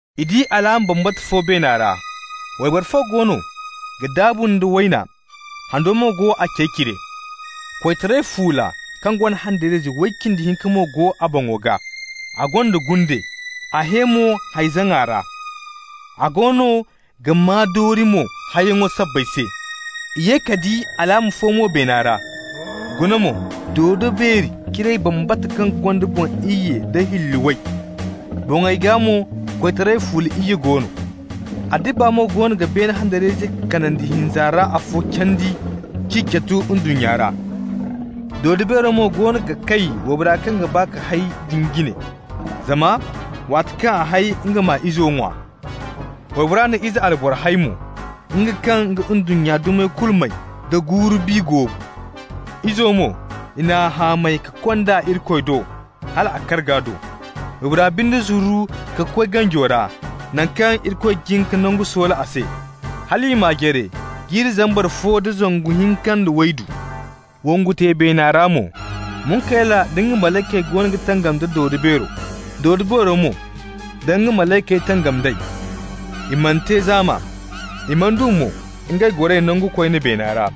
I di alaama bambata fo beena ra: wayboro fo goono ga daabu nda wayna, hando mo go a cey cire. Koytaray fuula kaŋ gonda handariyayze way cindi hinka mo go a boŋo gaa. A gonda gunde, a hẽ mo hay-zaŋay ra, a goono ga maa doori mo hayyaŋo sabbay se. I ye ka di alaama fo mo beena ra. Guna mo, dodo-beeri ciray bambata kaŋ gonda boŋ iyye da hilli way. Boŋey gaa mo koytaray fuula iyye go no. A dibba mo goono ga beene handariyayzey kanandi hinza ra afo candi k'i catu ndunnya ra. Dodo-beero mo goono ga kay waybora kaŋ ga ba ka hay din jine, zama waati kaŋ a hay nga m'a izo ŋwa. Waybora na ize alboro hay mo, nga kaŋ ga ndunnya dumey kulu may da guuru-bi goobu. Izo mo, i n'a hamay ka kond'a Irikoy do, hal a karga do. Waybora binde zuru ka koy ganjo ra, naŋ kaŋ Irikoy jin ka nangu soola a se, hal i m'a jare jirbi zambar fo da zangu hinka nda waydu. Wongu te beena ra mo. Munkayla nda nga malaykey goono ga tangam da dodo-beero. Dodo-beero mo da nga malaykey tangam d'ey. I mana te zaama, i mana du mo ngey goray nango koyne beena ra.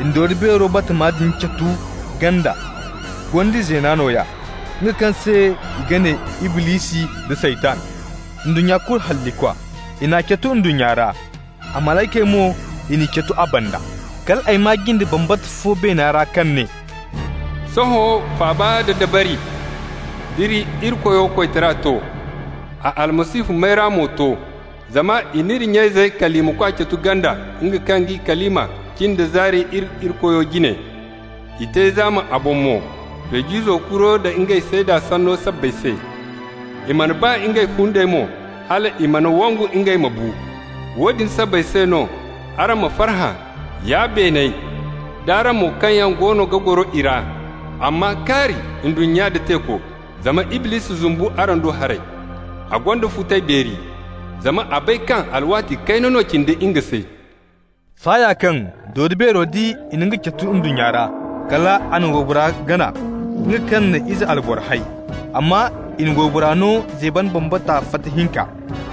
I na dodo-beero bambata din catu ganda, gondi zeena nooya, nga kaŋ se i ga ne Iblisi da Saytan, ndunnya kulu hallikwa. I n'a catu ndunnya ra. A malaykey mo, i n'i catu a banda. Kal ay maa jinde bambata fo beena ra kaŋ ne: «Sohõ faaba nda dabari nd'iri Irikoyo koytara to. A Almasihu mayra mo to. Zama i n'iri nya-izey kalimakwa catu ganda, nga kaŋ g'i kalima cin da zaari iri Irikoyo jine. I te zaama a boŋ mo Feej'izo kuro da ngey seeda sanno sabbay se. I mana ba ngey fundey mo hal i mana wangu ngey ma bu. Woodin sabbay se no, araŋ ma farhã, ya beeney d'araŋ mo kaŋ yaŋ goono ga goro i ra. Amma kaari ndunnya nda teeko! Zama Iblisi zumbu araŋ do haray. A gonda futay beeri, zama a bay kaŋ alwaati kayna no cindi nga se.» Saaya kaŋ dodo-beero di i na nga catu ndunnya ra, kal a na waybora gana, nga kaŋ na ize albora hay. Amma i na waybora no zeeban bambata fata hinka,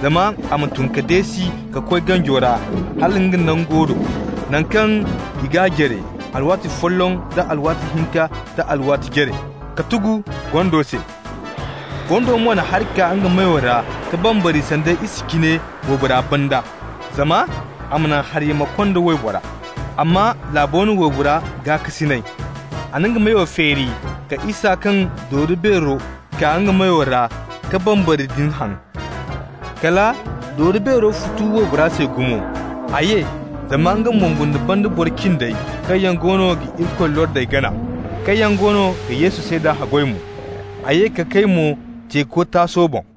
zama a ma tun ka deesi ka koy ganjo ra hala nga nango do, naŋ kaŋ i g'a jare, alwaati folloŋ da alwaati hinka da alwaati jare, k'a tugu gondo se. Gondo mo na hari kaa nga meyo ra ka bambari sanda isa cine waybora banda, zama a ma naŋ hari-yaa ma konda waybora. Amma laabo na waybora gaakasinay. A na nga meyo feeri ka isa kaŋ dodo-beero kaa nga meyo ra ka bambari din haŋ. Kala dodo-beero futu waybora se gumo. A ye zama nga ma wongu nd'a banda boro cindey kaŋ yaŋ goono ga Irikoy lordey gana, kaŋ yaŋ goono ga Yesu seeda haggoy mo. A ye ka kay mo teeko taaso boŋ.